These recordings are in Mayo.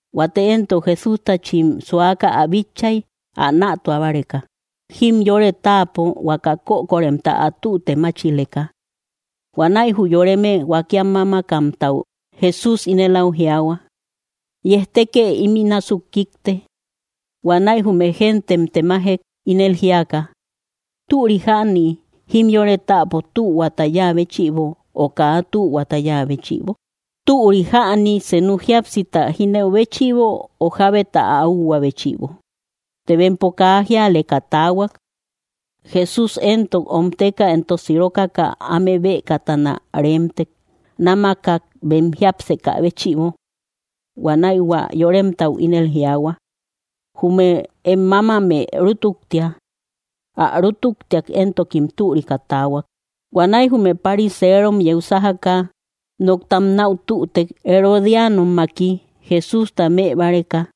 Huate éntok Jesústachim suaka ä bitchay, ä nätua báreka, jimyore táapo huaka kökoremta ä tüte máchileka. Huanäi jü yoreme huakiam mámakamtau Jesús ínel áu jiaahua: —Yejtekë ímï násuk kikte. Huanäi jume géntem temajek, ínel jíaka: —¿Türi jäni jimyore táapo tühuata yáa béchïbo, o kaa tühuata yáa béchïbo? ¿Türi jäni senu jíapsita jínëu béchïbo, o jábeta ä úhuä béchïbo? Të bempo kaa jíaleka taahuak. Jesús éntok omteka entok sirokaka áme bëkatana reemtek, námakak bem jiápsekä béchïbo. Huanäi hua yoremtau ínel jiaahua: —Jume em mámamë rútuktia. Ä rútuktiak éntokim türika taahuak. Huanäi jume pariserom yeu sájaka, noktam nau tütek Herodianommaki, Jesústa mëbáreka.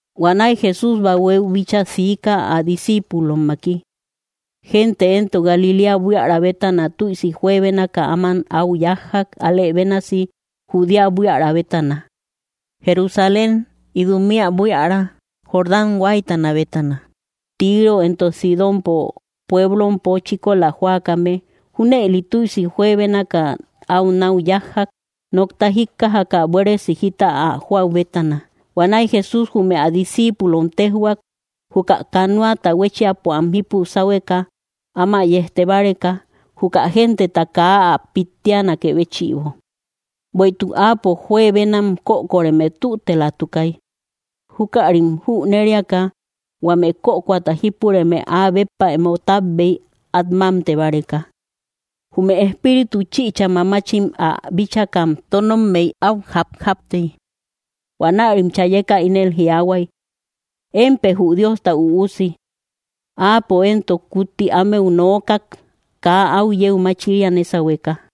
Huanäi Jesús bahuéu bíchaa siika, ä discíipulommaki. Gente éntok Galiléa buiära bétana tüisi juebénaka áman au yájjak; álë bénasi Judea buiära bétana, Jerusalén, Idumea buiära, Jordán huáytana bétana, Tiro entok Sidónpo pueblompo chíkola jóakame. Júnëli tüisi juebénaka au nau yájjak, nokta jíkkajaka buéresi jita ä joäu bétana. Huanäi Jesús jume ä discíipulom téjhuak, juka canoata huéchiapo am jípu sáhueka, áma yejte báreka, juka genteta kaa ä pittianakë béchïbo. Bueïtuk Áapo juebenam kökoreme tütelatukay. Júkärim jüneriaka, huame kökoata jípureme áa béppa emo tábbey, at mámte báreka. Jume espíritu chïcha mamachim ä bíchakam tónommey áu japjaptey. Huanärim chayeka ínel jiaahuay: —¡Émpë jü Diosta Üusi! Áapo éntok kutti ámeu nookak, kaa au yeu machiria nésahueka.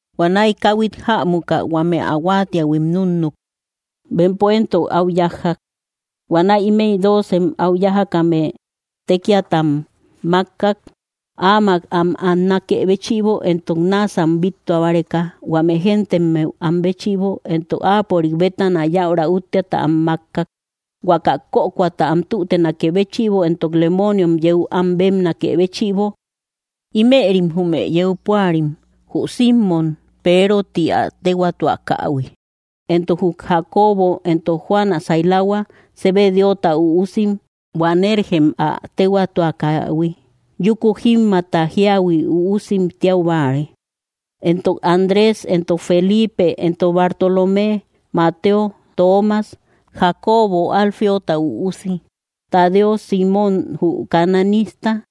Huanäi káhuit jämuka, huame ä huáatiähuim núnnuk; bempo éntok au yájjak. Huanäi ímëi dóocem au yájakame tékiata am mákkak, áamak am annakë béchïbo, entok náasam bíttua báreka, huame gentemmeu am béchïbo, entok áapörik bétana yäura útteata am makkak, huaka kökoata am tütenakë béchïbo, entok lemooniom yeu am bébnakë béchïbo: Ímërim jume yeu púarim: jü Simmom, Peero ti ä téhuaatuakähui, entok jü Jacobo entok Juan ä sailahua, Zebedeota üusim, Boanergem ä téhuaatuakähui, yúku jímmaata jíahui uusim tiau báare, entok Andrés, entok Felipe, entok Bartolomé, Mateo, Toomas, Jacobo Alfeota üusi, Tadeo, Simmom jü cananista,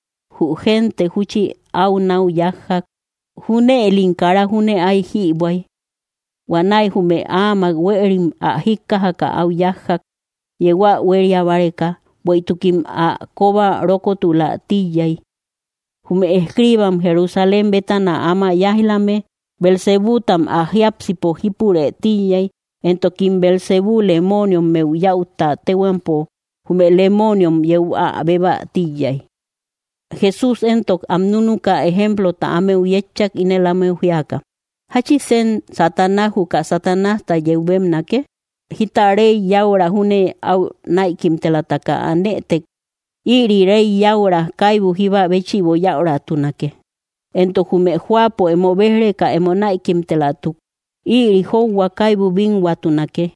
jü gente júchi au nau yájjak; junëlim kara júne ay jïbuäy. Huanäi jume áamak huéerim ä jíkkajaka au yájjak, yeu ä huéria báreka, bueïtukim ä kóba rókotulä tíiyay. Jume escriibam Jerusalén bétana áma yáij‑lame: —Beelzebútam ä jiápsipo jípurë tíiyay, entokim Beelzebú lemooniommeu yäutta téhuampo jume lemooniom yeu ä bébä tíiyay. Jesús éntok am núnuka, ejemplota ámeu yétchak, ínel ámeu jíaka: —¿Jáchisen Satanás juka Satanásta yeu bébnake? Jíta rey yäura júne au näikimtelataka anëtek, ïri rey yäura kaibu jíba béchïbo yäuratunake. Entok jume jóapo emo béj‑reka emo näikimtelatuk, ïri jóuhua kaibu bínhuatunake.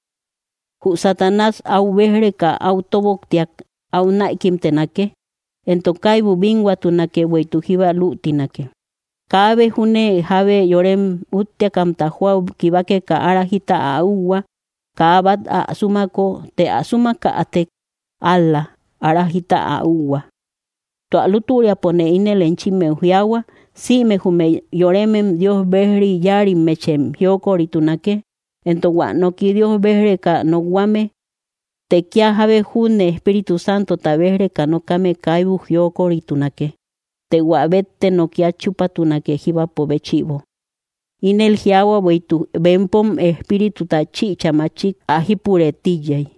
Jü Satanás au béj‑reka au tóboktiak, au näikimtenake, entok kaibu bínhuatunake, bueïtuk jíba luutinake. ’Kaabe júne jábe yorem útteakamta jóau kibakeka ára jita ä úhua, kaa bát ä súmako; të ä súmakätek ál‑la ára jita ä úhua. ’Tua lútüriapone ínel enchimmeu jiaahua, sïme jume yoremem Dios bejri yáarimmechim jiokoritunake, entok hua nooki Diosta béj‑reka nokhuame; të kia jábe junne Espíritu Santota béj‑reka nokame kaibu jiokoritunake, të hua bétte noki at chúpatunake jíbapo béchïbo. Ínel jiaahua bueïtuk bempom espírituta chïcha machik ä jípurë tíiyay.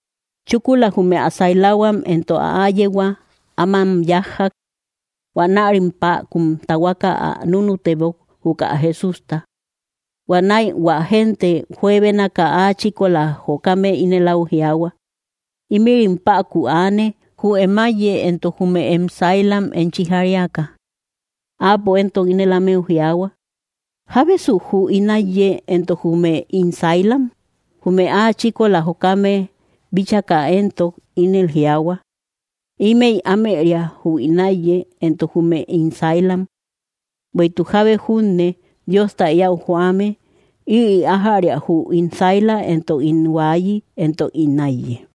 Chúkula, jume ä sailahuam entok ä áyehua ámam yájjak. Huanärim päkun tahuaka ä núnutebok, juka Jesústa. Huanäi hua gente juebénaka áa chíkola jokame ínel au jiaahua: —Ímïrim päku aane, jü em áiye entok jume em sailam enchi jariaka. Áapo éntok, ínel ámeu jiaahua: —¿Jábesu jü ín áiye, entok jume ín sailam? Jume áa chíkola jokame bíchaka éntok ínel jiaahua: —Ímëi ámëria jü ín áiye, entok jume ín sailam. Bueïtuk jábe junne Diosta eäu joame, ïri ájäria jü ín saila, entok ín huaayi, entok ín áiye.